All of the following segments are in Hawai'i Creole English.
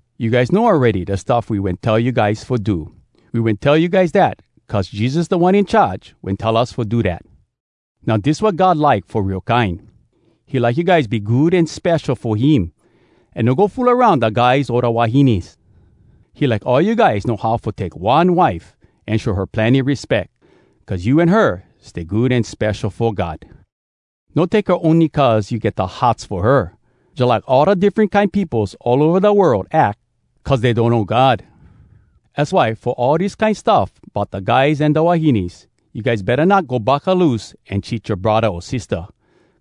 You guys know awready da stuff we wen tell you guys fo do. We wen tell you guys dat, cuz Jesus Da One In Charge wen tell us fo do dat. Now dis wat God like fo real kine. He like you guys be good an spesho fo him, an no go fool aroun da guys o da wahines. He like all you guys know how fo take one wife an show her plenny respeck, cuz you an her stay good an spesho fo God. No take her ony cuz you get da hots fo her, jalike all da diffren kine peopos all ova da world ack cuz dey donno God. Az why fo all dis kine stuff bout da guys an da wahines, you guys betta not go buckaloose an cheat yoa braddah o sistah.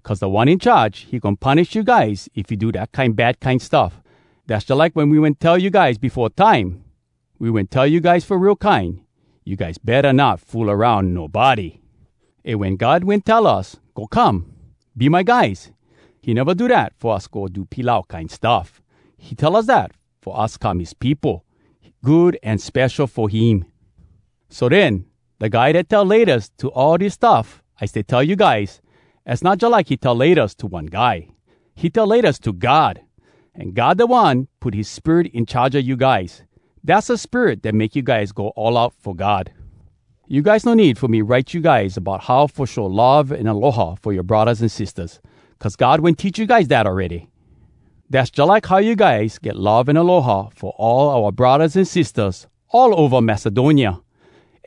Cuz Da One In Charge, he goin punish you guys if you do dat kine bad kine stuff. Dass jalike we wen tell you guys befo time. We wen tell you guys fo real kine, “You guys betta not fool aroun nobody!” Eh, wen God wen tell us, “Go come! Be my guys!” he neva do dat fo us go do pilau kine stuff! He tell us dat fo us come his peopo, good an spesho fo him! So den, da guy dat tell “Laytas” to all dis stuff I stay tell you guys, az not jalike he tell “Laytas” to one guy, he tell “Laytas” to God! An God da One put his Spirit in charge a you guys. Dass da Spirit dat make you guys go all out fo God. You guys no need fo me write you guys bout how fo show love an aloha fo yoa braddahs an sistahs. Cuz God wen teach you guys dat awready. Dass jalike how you guys get love an aloha fo all oua braddahs an sistahs all ova Macedonia.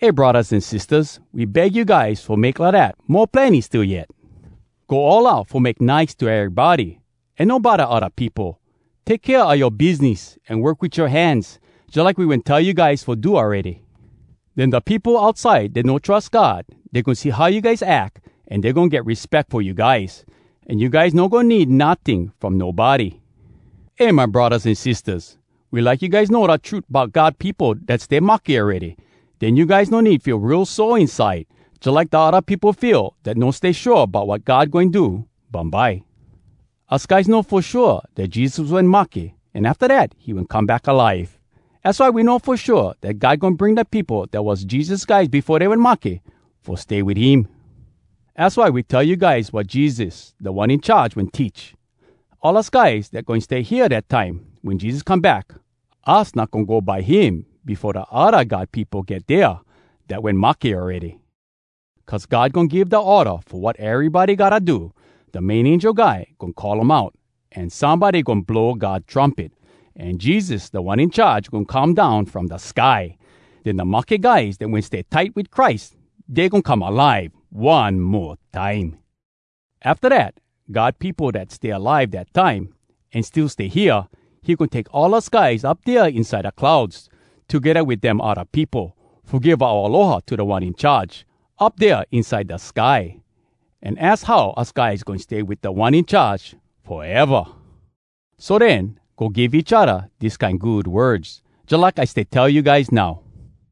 Eh braddahs an sistahs, we beg you guys fo make lidat mo plenny still yet. Go all out fo make nice to erybody, an no bodda odda peopo. Take kea a yoa biznis, an work wit yoa hands, jalike we wen tell you guys fo do awready. Den da peopo outside dat no trus God, dey goin see how you guys ack, an dey goin get respeck fo you guys. An you guys no goin need notting from nobody. Eh, my braddahs an sistahs! We like you guys know da trut bout God peopo dat stay mahke awready. Den you guys no need feel real sore inside, jalike da odda peopo feel dat no stay shua bout wat God goin do bumbye. Us guys know fo shua dat Jesus wen mahke, an afta dat, he wen come back alive! Az why we know fo shua dat God goin bring da peopo dat was Jesus guys befo dey wen mahke fo stay wit him. Az why we tell you guys wat Jesus, Da One In Charge, wen teach. All us guys dat goin stay hea dat time wen Jesus come back, us not goin go by him befo da odda God peopo get dea dat wen mahke awready. Cuz God goin give da orda fo wat erybody gotta do. Da main angel guy goin call um out, an somebody goin blow God trumpet. An Jesus, Da One In Charge, goin come down from da sky! Den da mahke guys dat wen stay tight wit Christ, dey goin come alive one mo time! Afta dat, God peopo dat stay alive dat time an still stay hea, he goin take all us guys up dea inside da clouds, togedda wit dem odda peopo, fo give oua aloha to Da One In Charge, up dea inside da sky. An az how us guys goin stay wit Da One In Charge foeva! So den, go give each odda dis kine good words, jalike I stay tell you guys now.